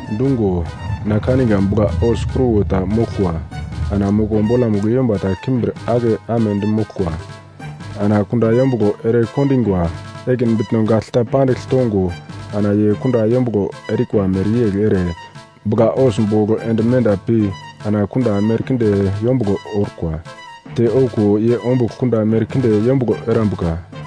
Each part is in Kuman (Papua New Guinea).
Dungo na kaniga bugla-hos kruwo ta moglkwa, ana moko bolamugl yomba ta kimbir ake amedi moglkwa. Ana kunda yombuglo erekondingwa ekin bitno gagl ta pandigl tongo ana ye kunda yombuglo erikwa mereyegl ere bugla-hos bogl ende menda pi ana kunda merkinde yombuglo orkwa, te okuwo ye ombugl kunda merkinde yombuglo erambuka.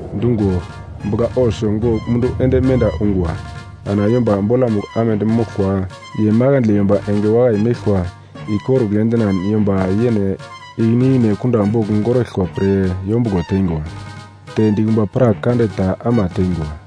Dungo bugla-hos gogl mundu ende menda ungwa. Ana yomba bolamugl amedi moglkwa, ye makandle yomba enge wakai meglkwa ikorugl endinan yomba yene ikine ikine kunda bogl goraglkwa pre yombuglo tengwa, te dikumba prak kande ta ama tengwa.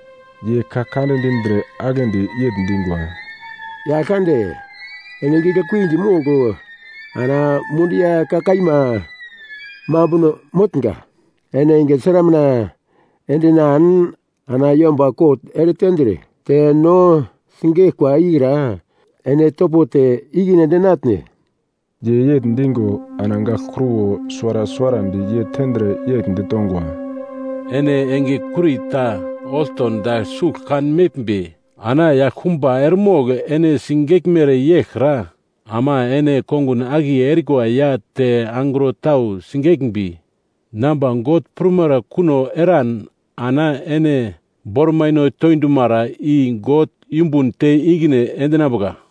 Ye ka kande dindre aglendi yegl dingwa, “Yaglkande, ene giglekuidi mogl ana holi ya ka kaima mambuno motnga. Ene enge sramuna endinan ana yomba kot eretendre te no sigeglkwa ikra ene topo te ikine endinatne?” Ye yegl digo ana gagl kruwo suwara suwarandi ye tendre yegl ditongwa, “Ene enge kurita olto dagl sugl kanmeglmbi ana yaglkumba eremogl ene sigeglmere yeglkra ama ene kongun akiye erikwa ya te angro tau sigeglmbi namba God prumere kuno eran ana ene bormaino toidumara i God yumbun te ikine endinambuka.”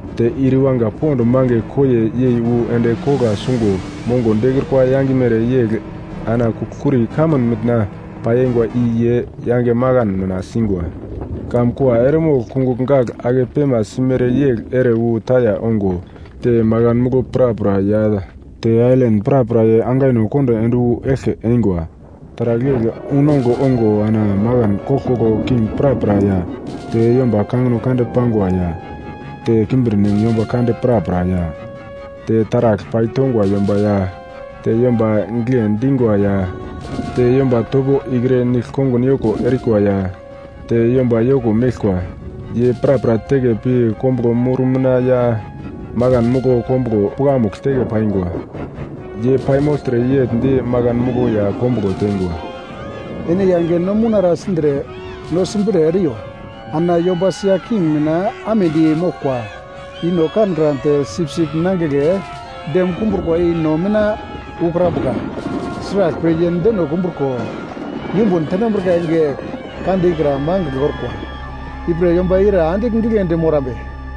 Te ir iwanga pond mange koiye yei wu endi kogla sungo mongo dekrukwa yangimere yegl ana kugl-kuri kamun mitna pai eingwa i yei yange makan mina singwa. Kamkua eremogl kungugl gagl ake pemasimere yegl ere wu taya ongo te makan muglo prapra ya te ailan prapra ye angaino kondo ende wu eglke eingwa. Taragl yegl unongugl ongo ana makan koglkoglo king prapra ya te yomba kangino kande pangwa ya te kimbirnem yomba kande prapra ya, te taragl paitongwa yomba ya te yomba gigle dingwa ya te yomba topo ikre nigl-kongun yoko erikwa ya te yomba yoko meglkwa, ye prapra teke pi kombuglo mur mina ya makan muglo kombuglo pukamugl teke paingwa. Ye paimogltre yegl di makan muglo ya kombuglo tengwa, “Ene yange no mounara sindre no simbre eriyo. Ana yomba sia king mina amedi moglkwa i no kankran te Sipsip Nangigle dem kumbrukwa i no mina ukrambuka. Sraglpre, ye deno kumbruko yumbun tenambrika enge kande ikra magl orkwa, ipre yomba ira andigl giglendi morambe?”